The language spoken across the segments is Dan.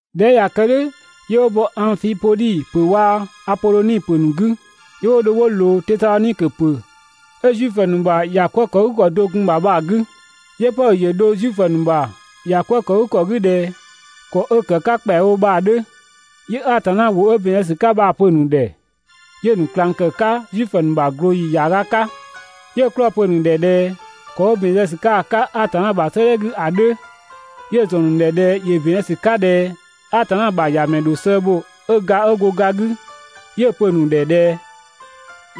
꞊Dhɛ 'ö ꞊ya kë "dhʋ̈, 'yö 'wo bɔ Angfipodhi ‑pö waa‑ Apodhoni ‑pö ‑nu 'gü, 'yö 'wo dho 'wo ꞊loo Tesadhonikö ‑pö 'ö Zuifö ‑nu ‑bha ‑bhɔ "kwëë ‑kɔ do‑ gun‑ ‑bha bha‑ 'gü. 'Yö Pɔdhö ‑yö dho Zuifö ‑nu ‑bha ‑bhɔ "kwëë ‑kɔ 'gü ꞊dhɛ ‑kɔ 'ö‑ ‑kë 'ka ‑kpɛawo bha‑ 'dhö. 'Yö Atanna ‑wʋ 'ö ‑bɛn zë ‑sü 'ka bha‑ pö‑ ‑nu ‑dhɛ, 'yö‑ ‑nu ꞊klang ‑kë 'ka Zuifö ‑nu ‑bha ꞊glooyi ‑yaaga 'ka. 'Yö‑ 'klɔɔ‑ ‑nu pö‑ ‑nu ‑dhɛ ꞊dhɛ ‑kɔ 'ö ‑bɛn zë ‑sü 'ka‑ 'ka Atanna ‑bha 'sëëdhɛ 'gü ‑a 'dhö, 'yö‑ ‑zɔn ‑nu ‑dhɛ ꞊dhɛ ‑yö ‑bɛn zë ‑sü 'ka ꞊dhɛAtanna ‑bha ‑Yamɛ ‑dho sëë bho 'ö ga, 'ö go ga 'gü. 'Yö‑ pö‑ nu ‑dhɛ ꞊dhɛ: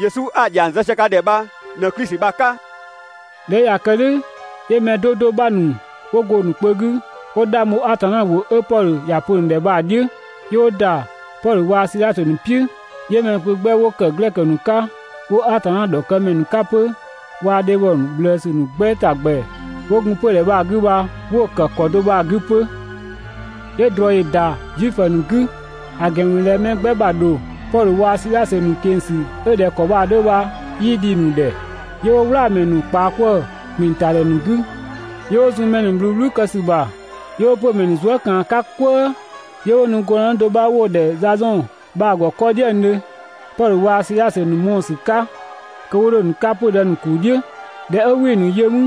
«Yesu 'a‑ ‑dhiang zë sië ka ‑dhɛ bha ꞊në Klisi bha‑ 'ka.» ꞊Dhɛ 'ö ꞊ya kë "dhʋ̈, 'yö mɛ 'do 'do 'bha ‑nu ‑wo go‑ ‑nu kpö 'gü 'wo 'dhang bho Atanna ‑wʋ 'ö Pɔdhö ‑ya pö‑ ‑nu ‑dhɛ bha‑ "dhiʋ̈, 'yö 'wo ‑da Pɔdhö waa‑ Sidhasö ‑nu "piʋ̈. 'Yö mɛ kpö 'gbɛ 'wo ‑kë Glɛkö ‑nu 'ka 'wo Atanna ‑dhɔkëmɛ ‑nu 'ka 'pö waa‑ dhebhɔ ꞊bhlëësü ‑nu 'gbɛ ‑ta ‑gbɛ 'wo gun 'pödhɛ bha‑ 'gü bha 'wo‑ ‑kë ‑kɔ do bha‑ 'gü 'pö. 'Yö ꞊drɔ ‑yö ‑da Zuifö ‑nu 'gü, ‑a ‑gɛn ‑mü ꞊dhɛ mɛ 'gbɛ ‑bha ‑dho Pɔdhö waa‑ Sidhasö ‑nu ꞊keng‑ ‑sü 'ö ꞊dhɛ ‑kɔ bha‑ 'dhö bha 'yii dhi‑ ‑nu ‑dhɛ. 'Yö 'wo "wlaamɛ ‑nu ꞊kpaa 'kwëë‑ ‑kpinng ‑ta ‑dhɛ ‑nu 'gü, 'yö 'wo zun mɛ ‑nu ꞊bhluu "bhluu kë ‑sü ‑bha 'yö 'wo 'pö‑ ‑mɛ ‑nu zuë" ꞊kaan‑ 'ka "kwëë, 'yö 'wo nu gɔndënë do 'bha 'wo‑ ‑dhɛ Zazɔn bha‑ ‑gɔ 'kɔ "dhiëngdhö, Pɔdhö waa‑ Sidhasö ‑nu mɔɔ‑ ‑sü 'ka kö 'wo 'dho‑ ‑nu 'ka 'pö‑ dë ‑nu ‑kuu "dhiʋ̈. ꞊Dhɛ 'ö 'wii‑ ‑nu yö 'mü,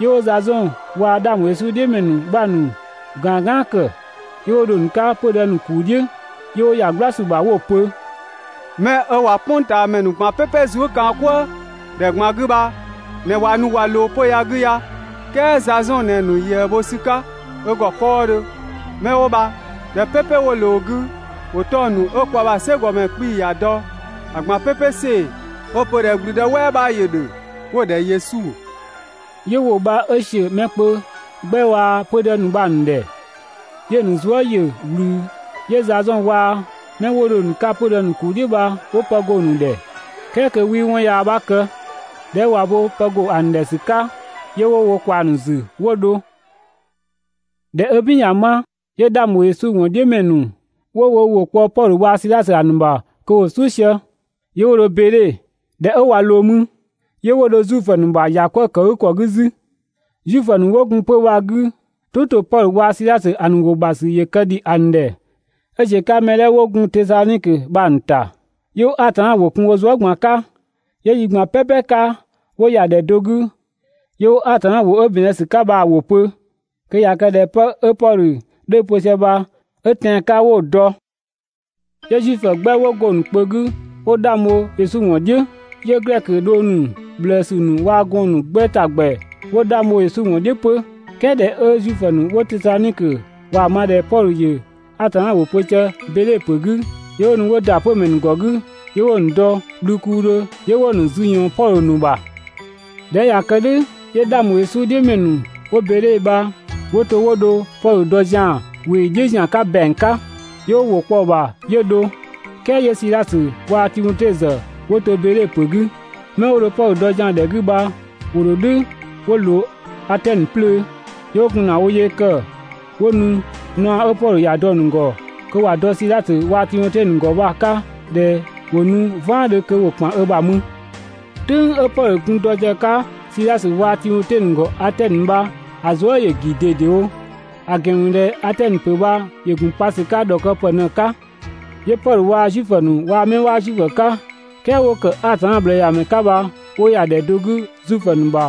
'yö 'wo Zazɔn waa‑ 'dhang ‑bho Yesu "dhiʋ̈ ‑mɛ ‑nu 'bha ‑nu ꞊gaan "gaan ‑kë, 'yö 'wo dho‑ ‑nu 'ka 'pödë ‑nu ‑kuu "dhiʋ̈, 'yö 'wo ‑ya "gbla ‑sü ‑bha 'wo‑ pö: «'Mɛ ꞊wa "kpʋngtaamɛ ‑nu ꞊gban "pɛpɛ zuëkaankwëëdhe ꞊gban 'gü bha ꞊në ꞊wa nu ꞊wa ꞊loo 'pö‑ ya‑ 'gü ya! "Kɛɛ Zazɔn ꞊në‑ ‑nu ꞊yëë bho ‑sü 'ka ö ‑gɔ 'kɔɔdhö! 'Mɛ 'wo bha ‑dhɛ "pɛpɛ 'wo ꞊loo‑ 'gü, ‑wo 'tɔng‑ ‑nu 'ö kwa ‑bha "sɛkɔɔnmɛ 'kpii‑ ‑ya dɔ bha‑ ꞊gban "pɛpɛ ‑see, 'ö 'wo‑ pö ꞊dhɛ ‑gblüdë "wɛɛ 'bha ‑yö ‑dhö 'wo‑ ‑dhɛ Yesu!» 'Yö ‑wʋ bha 'ö ‑siö mɛ kpö 'gbɛ waa‑ 'pödë ‑nu ‑dhɛ, 'yö‑ ‑nu zuë" ‑yö ꞊wlü. 'Yö Zazɔn waa‑ 'mɛ 'wo dho‑ ‑nu 'ka 'pö‑ dë ‑nu ‑kuu "dhiʋ̈ bha 'wo pë go‑ ‑nu ‑dhɛ "kɛɛ kö 'wii 'wɔn yaa 'bha kë. ꞊Dhɛ 'ö ꞊wa bo pë ‑go ‑a ‑nu ‑dhɛ ‑sü 'ka, 'yö 'wo wo ꞊kwaa‑ ‑nu ‑zü 'wo dho. ꞊Dhɛ 'ö "bin ꞊ya 'ma, 'yö 'dhang ‑bho Yesu ‑wɔn "dhiʋ̈ ‑mɛ ‑nu 'wo wo ‑wʋ kpɔ Pɔdhö waa‑ Sidhasö ‑a ‑nu ‑bha kö ‑wo "suʋ̈ sië, 'yö 'wo dho Beedhe. ꞊Dhɛ 'ö ꞊wa ꞊loo mü, 'yö 'wo dho Zuifö ‑nu ‑bha ‑yakwëëkëgükɔ 'gü 'zü. Zuifö ‑nu 'wo gun 'pö‑ bha‑ 'gü, "tʋ ‑to Pɔdhö waa‑ Sidhasö ‑nu ‑wʋ ‑bha ‑sü ‑yö kë ‑dhi ‑a ‑nu ‑dhɛ 'ö ꞊ziö‑ 'ka mɛ 'dhɛ 'wo gun Tesadhonikö bha‑ ‑nu ‑ta. 'Yö 'wo Atanna ‑wʋ kun 'zü wo zuë" ꞊gban‑ 'ka, 'yö yi ꞊gban "pɛpɛ 'ka 'wo ‑ya ‑dhɛ do 'gü, 'yö 'wo Atanna ‑wʋ 'ö ‑bɛn zë ‑sü 'ka bha‑ ‑wʋ pö kö ꞊ya kë ꞊dhɛ 'pë 'ö Pɔdhö 'dhö‑ pö sië bha 'ö tɛan‑ 'ka 'wo‑ dɔ. 'Yö Zuifö 'gbɛ 'wo go‑ ‑nu kpö 'gü 'wo 'dhang bho Yesu ‑wɔn "dhiʋ̈. 'Yö Glɛkö dhong ‑nu ꞊bhlëësü ‑nu waa‑ gɔɔn‑ ‑nu 'gbɛ ‑ta ‑gbɛ 'wo 'dhang bho Yesu ‑wɔn "dhiʋ̈ 'pö. "Kɛɛ ꞊dhɛ 'ö Zuifö ‑nu 'wo Tesadhonikö ꞊waa‑ ma ꞊dhɛ Pɔdhö ‑yö Atanna ‑wʋ pö sië Beedhe ‑pö 'gü, 'yö 'wo nu 'wo ‑da 'pö‑ ‑mɛ ‑nu ‑gɔ 'gü, 'yö 'wo‑ ‑nu dɔ bhlukuudhö, 'yö 'wo‑ ‑nu zü ꞊yɔɔn Pɔdhö ‑nu ‑bha. ꞊Dhɛ 'ö ꞊ya kë "dhʋ̈ 'yö 'dhang ‑bho Yesu "dhiʋ̈ ‑mɛ ‑nu 'wo Beedhe bha 'wo to 'wo dho Pɔdhö dɔ zian‑ ꞊weeyi "dhiʋ̈ ‑zian 'ka ‑bɛang 'ka, 'yö 'wo ‑wʋ kpɔ‑ ‑bha 'yö dho. "Kɛɛ 'yö Sidhasö waa‑ Timote ‑zë ‑wo ‑to Beedhe ‑pö 'gü. 'Mɛ 'wo dho Pɔdhö ‑dɔ zian ‑dhɛ 'gü bha ‑wo ‑dho "dhʋ̈ 'wo ꞊loo Atɛnö 'plöö. 'Yö 'wo gun ‑na wo yee ‑kë 'wo nu naɔ 'ö Pɔdhö ‑ya dɔ‑ ‑nu ‑gɔ kö ‑wa dɔ Sidhasö waa‑ Timote ‑a ‑nu ‑gɔ bha‑ 'ka ꞊dhɛ ‑wo nu "vaandhö kö ‑wo ‑kpan ö ‑bha mü. "Tʋ̈ng 'ö Pɔdhö gun dɔ sië‑ 'ka Sidhasö waa‑ Timote ‑nu ‑gɔ Atɛnö bha, ‑a zuë" ‑yö ‑gi ꞊dedewo, ‑a ‑gɛn ‑mü ꞊dhɛ Atɛnö ‑pö bha ‑yö ‑gun pa ‑sü 'ka ‑dhɔkëpë ꞊në‑ 'ka. 'Yö Pɔdhö waa‑ Zuifö ‑nu waa‑ 'mɛ 'waa Zuifö 'ka "kɛɛ 'wo ‑kë Atanna ꞊bhlëëyamɛ ‑nu 'ka bha wo ‑ya ‑dhɛ do 'gü Zuifö ‑nu ‑bha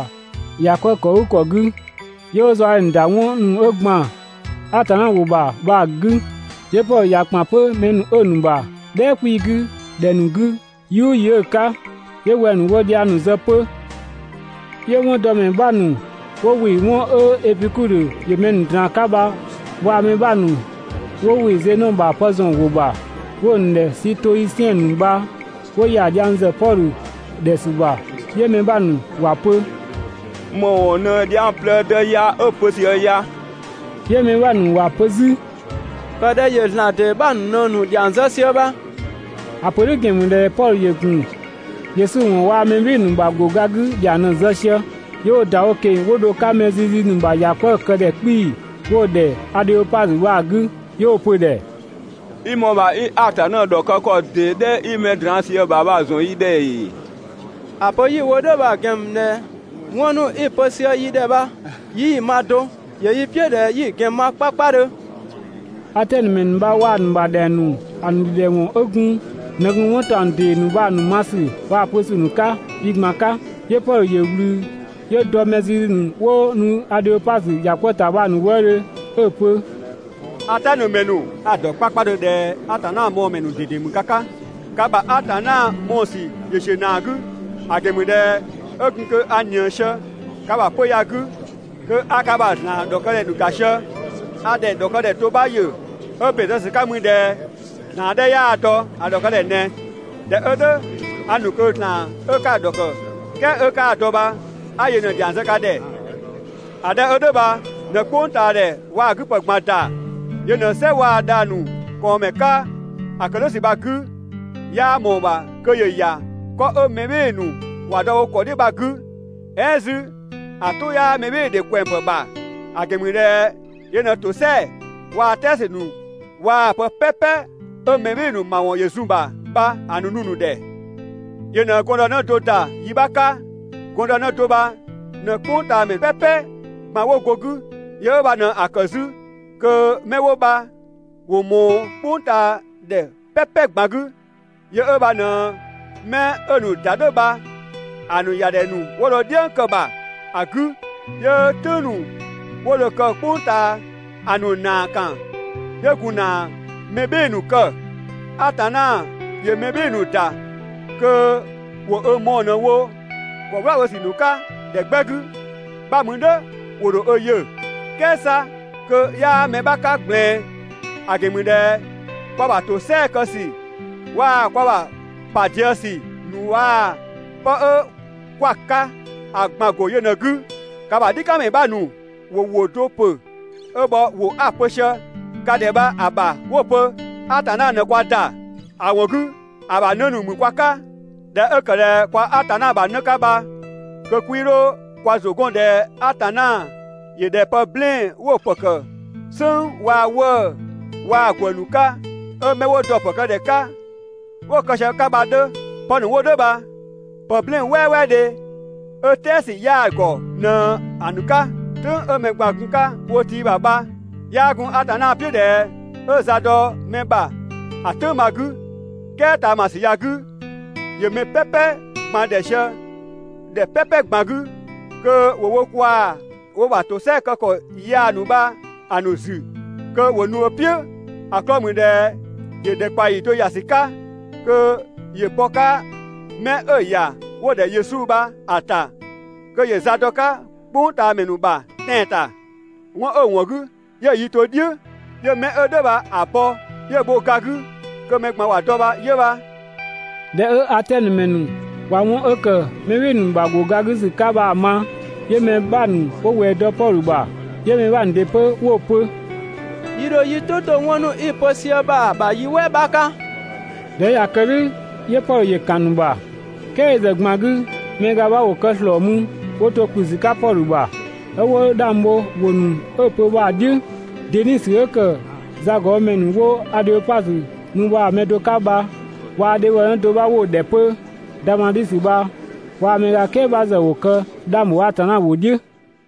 ‑bhɔ "kwëë ‑kɔ 'gü, 'yö 'wo zaɔdhe ‑nu ‑da ('wɔn ‑nu 'ö ‑gban Atanna ‑wʋ ‑bha bha‑ 'gü). 'Yö Pɔdhö ꞊ya ‑kpan 'pö 'mɛ ‑nu 'ö‑ ‑nu ‑bha "dhɛɛ 'kpii‑ 'gü ‑dhɛ ‑nu 'gü yi "ʋʋ yi 'ö‑ 'ka, 'yö wɛng‑ ‑nu 'wo dhiang ‑nu zë 'pö. 'Yö 'wɔndɔmɛ 'bha ‑nu 'wo ‑wɩ 'wɔn 'ö Epikudhö ‑yö mɛ ꞊draan‑ 'ka bha waa‑ mɛ 'bha ‑nu 'wo ‑wɩ Zenɔ ‑bha pë ‑zɔn ‑wʋ ‑bha, 'wo‑ ‑nu ‑dhɛ Sitoisiɛn ‑nu bha 'wo ‑ya dhiang ‑zë Pɔdhö ‑dhɛ ‑sü ‑bha. 'Yö mɛ 'bha ‑nu ‑wa pö: «‑Më ‑wɔn ꞊në dhiang plëëdë ya 'ö‑ pö sië‑ ya?» 'Yö mɛ 'bha ‑nu ‑wa pö 'zü: «‑Kë ꞊dhɛ ‑yö ‑zlan ‑dee 'bha ‑nu ꞊në‑ ‑dhiang zë sië bha!» ‑A ‑pö "dhʋ̈ ‑gɛn ‑mü ꞊dhɛ Pɔdhö ‑yö ‑gun Yesu ‑wɔn waa‑ mɛ "bhɩɩ‑ ‑nu ‑bha ‑go ga 'gü ‑dhiang ꞊në‑ zë sië. 'Yö 'wo‑ ‑da wo ꞊keng‑ 'wo dho‑ 'ka mɛ zizi ‑nu ‑bha ‑yakwëëkëdhɛ 'kpii‑ 'wo‑ ‑dhɛ ‑dhɛ Adheopazö bha‑ 'gü, 'yö 'wo‑ pö‑ ‑dhɛ: «I ‑mɔɔ ‑bha 'i Atanna ‑dhɔkë ‑kɔ ‑dee 'dhɛ 'i mɛ draan‑ sië‑ ‑bha bha‑ ‑zɔn yi ‑dhɛ ‑ee? ‑A pö 'yi‑ wo "dhʋ̈ bha‑ ‑gɛn ‑mü ꞊dhɛ 'wɔn ‑nu 'i‑ pö sië yi ‑dhɛ bha 'yii‑ ma do, ‑yö yi "piʋ̈ ꞊dhɛ 'yi‑ ‑gɛn ma 'kpakpadhö.» (Atɛnö ‑mɛ ‑nu bha waa‑ ‑nu ‑bha ‑dhɛng ‑nu ‑a ‑nu ‑dhidhɛwɔn 'ö gun ꞊në gun 'wɔn ‑taɔng ‑dee ‑nu bha‑ ma ‑sü waa‑ pö ‑sü ‑nu 'ka yi ꞊gban 'ka.) 'Yö Pɔdhö ‑yö ꞊wlü 'yö dɔ mɛ zizi ‑nu 'wo nu Adheopazö ‑ya "kwëë ‑ta bha‑ ‑nu wëëdhö 'ö‑ pö: «Atɛnö ‑mɛ ‑nu, a‑ dɔ 'kpakpadhö ꞊dhɛ Atanna mɔɔ‑ ‑mɛ ꞊dede ‑mü ka 'ka, ka ‑bha ‑zlan mɔɔ‑ ‑sü ‑yö ‑ziö ‑naa 'gü; ‑a ‑gɛn ‑mü ꞊dhɛ 'ö gun kö a ꞊nië sië‑ 'ka ‑bha 'pödhɛ ya‑ 'gü kö a ka ‑bha ‑zlan ‑dhɔkëdhɛ ‑nu ‑ga sië, a ‑dhɛ ‑dhɔkëdhɛ do 'bha ‑yö 'ö ‑bɛn zë ‑sü 'ka mü ꞊dhɛ: «Atanna 'ö 'yaa‑ dɔ ‑a ‑dhɔkëdhɛ ꞊nɛ.» ꞊Dhɛ 'ö "dhʋ̈ a ‑nu kö Atanna 'ö 'ka‑ ‑dhɔkë "kɛɛ 'ö 'kaa‑ dɔ bha 'a yö ꞊në‑ ‑dhiang zë ka ‑dhɛ. Atanna 'ö "dhʋ̈ bha ꞊në "kpʋngtaadhɛ waa‑ ö 'gü ‑pë ꞊gban ‑da, yö ꞊në "sɛ waa‑ dhang‑ ‑nu ꞊kɔɔnmɛ 'ka, ‑a ‑kë "dhʋ̈ ‑sü bha‑ 'gü, 'yaa ꞊mɔɔ‑ ‑bha kö ‑yö ‑ya 'kɔ 'ö mɛ "bhɩɩ‑ ‑nu ‑wa dɔ wo ‑kɔ "dhiʋ̈ bha‑ 'gü. "Ɛɛn 'zü, ‑a "tʋ 'yaa mɛbhɩɩdhe ꞊kwɛngpë ‑bha, ‑a ‑gɛn ‑mü ꞊dhɛ yö ꞊në ‑tosɛa waa‑ "tɛɛ ‑sü ‑nu waa‑ pë "pɛpɛ 'ö mɛ "bhɩɩ‑ ‑nu ‑mawɔn ‑yö zun‑ ‑bha bha‑ nu‑ ‑nu ‑dhɛ. Yö ꞊në gɔndënë do ‑da yi 'bha 'ka. Gɔndënë do bha ꞊në "kpʋngtaamɛ "pɛpɛ ꞊gban 'wo go‑ 'gü. Yö 'ö bha ꞊në‑ ‑kë 'zü kö 'mɛ 'wo bha ‑wo ꞊mɔɔ "kpʋngtaadhɛ "pɛpɛ ꞊gban 'gü. Yö 'ö bha ꞊në 'mɛ 'ö‑ ‑nu ‑da "dhʋ̈ bha‑ ‑nu ‑ya ‑dhɛ ‑nu 'wo dho "dhiëng kë‑ ‑bha 'gü 'yö "tʋ̈ng ‑nu 'wo dho‑ kë "kpʋng ꞊taa ‑a ‑nu ‑naa ‑kan 'yö gun ‑na mɛ "bhɩɩ‑ ‑nu kë. Atanna ‑yö mɛ "bhɩɩ‑ ‑nu ‑da kö ‑wo ö mɔɔ‑ ꞊në‑ wo ‑kɔ "wla bho ‑sü 'ka ‑dhɛ 'gbɛ 'gü, 'bha mü "dhʋ̈ ‑wo ‑dho ö yö. "Kɛɛ 'sa kö 'yaa mɛ 'bha 'ka ꞊gblɛɛn. ‑A ‑gɛn ‑mü ꞊dhɛ kwa ‑bha ‑tosɛa kë ‑sü waa‑ kwa ‑bha ‑pa diëë ‑sü ‑nu waa‑ 'pë 'ö 'kwa‑ 'ka ‑a ꞊gban‑ ‑go yö ꞊në‑ 'gü. Ka ‑bha "dhikanmɛ 'bha‑ ‑nu ‑wo ‑wʋ do ‑pö 'ö bhɔ ‑wʋ 'a‑ pö sië ka ‑dhɛ bha‑ ‑bha 'wo‑ pö: «Atanna ꞊në kwa ‑da, ‑a ‑wɔn 'gü ‑a ‑bha 'në ‑nu ‑mü kwa 'ka.» ꞊Dhɛ 'ö ‑kë ꞊dhɛ kwa Atanna ‑bha 'në 'ka bha kö 'kwii 'dho kwa ‑zʋ 'gɔn ꞊dhɛ Atanna ‑yö ꞊dhɛ pë "blɛɛn‑ 'wo‑ ‑pë ‑kë "sënng waa‑ 'wëë‑ waa‑ ‑gwë ‑nu 'ka, 'ö 'mɛ 'wo dɔ‑ ‑pë kë ‑dhɛ 'ka 'wo‑ kë sië‑ 'ka bha‑ 'dhö. (Pë ‑nu 'wo "dhʋ̈ bha pë "blɛɛn‑ "wɛɛwɛɛdhe 'ö "tɛɛ ‑sü 'yaa‑ ‑gɔ ꞊në‑ ‑nu 'ka.) "Tʋ̈ng 'ö mɛ ꞊gban‑ gun‑ 'ka wo tiibha bha, 'yaa gun Atanna "piʋ̈ ꞊dhɛ 'ö za dɔ mɛ ‑bha ‑a "tʋ̈ng bha‑ 'gü, "kɛɛ ꞊taamasü ya‑ 'gü, ‑yö mɛ "pɛpɛ ꞊gban ‑dhɛ sië ‑dhɛ "pɛpɛ ꞊gban 'gü kö ‑wo wo kwaa wo ‑bha ‑tosɛa kë ‑kɔ yaa ‑nu bha‑ ‑nu ‑zü kö ‑wo nu ö "piʋ̈. ‑A 'klɔɔ‑ ‑mü ꞊dhɛ ‑yö ‑dhɛkpaɔyi do ‑ya ‑sü 'ka kö ‑yö bɔ‑ 'ka mɛ 'ö‑ ‑ya ('wo‑ ‑dhɛ Yesu) bha‑ ‑ta kö ‑yö za dɔ‑ 'ka "kpʋngtaamɛ ‑nu ‑bha tɛan‑ ‑ta. 'Wɔn 'ö‑ ‑wɔn 'gü 'yö‑ yi to "dhiʋ̈ 'yö 'mɛ 'ö "dhʋ̈ bha‑ bɔ, 'yö‑ bho ga 'gü kö mɛ ꞊gban ‑wa dɔ bha 'yö bha. ꞊Dhɛ 'ö Atɛnö ‑mɛ ‑nu ꞊wa 'wɔn 'ö ‑kë mɛ "bhɩɩ‑ ‑nu ‑bha ‑go ga 'gü ‑sü 'ka bha‑ ma, 'yö mɛ 'bha ‑nu 'wo ꞊wɛɛ dɔ Pɔdhö ‑bha, 'yö mɛ 'bha ‑nu ‑dɩ 'pö 'wo‑ pö: «Yi ‑dho yi "tʋ 'to 'wɔn ‑nu 'i‑ pö sië bha‑ ‑bha yi "wɛɛ 'bha 'ka. ꞊Dhɛ 'ö ꞊ya kë "dhʋ̈, 'yö Pɔdhö ‑yö ‑kan ‑nu ‑bha. "Kɛɛ yö ‑zë ꞊gban 'gü, mɛ ga 'bha ‑wo kë ‑slɔɔ mü 'wo to ‑kplü ‑sü 'ka Pɔdhö ‑bha, 'ö 'wo 'dhang bho ‑wʋ ‑nu 'ö‑ pö bha‑ "dhiʋ̈. Denisi 'ö ‑kë zagɔbhomɛ ‑nu 'wo Adheopazö mü bha‑ mɛ do 'ka bha waa‑ dhebhɔnë do 'bha 'wo‑ ‑dhɛ 'pö Damadhisö bha waa‑ mɛ ga "kɛɛ bha ‑zë ‑wo kë 'dhang ‑bho Atanna ‑wʋ "dhiʋ̈.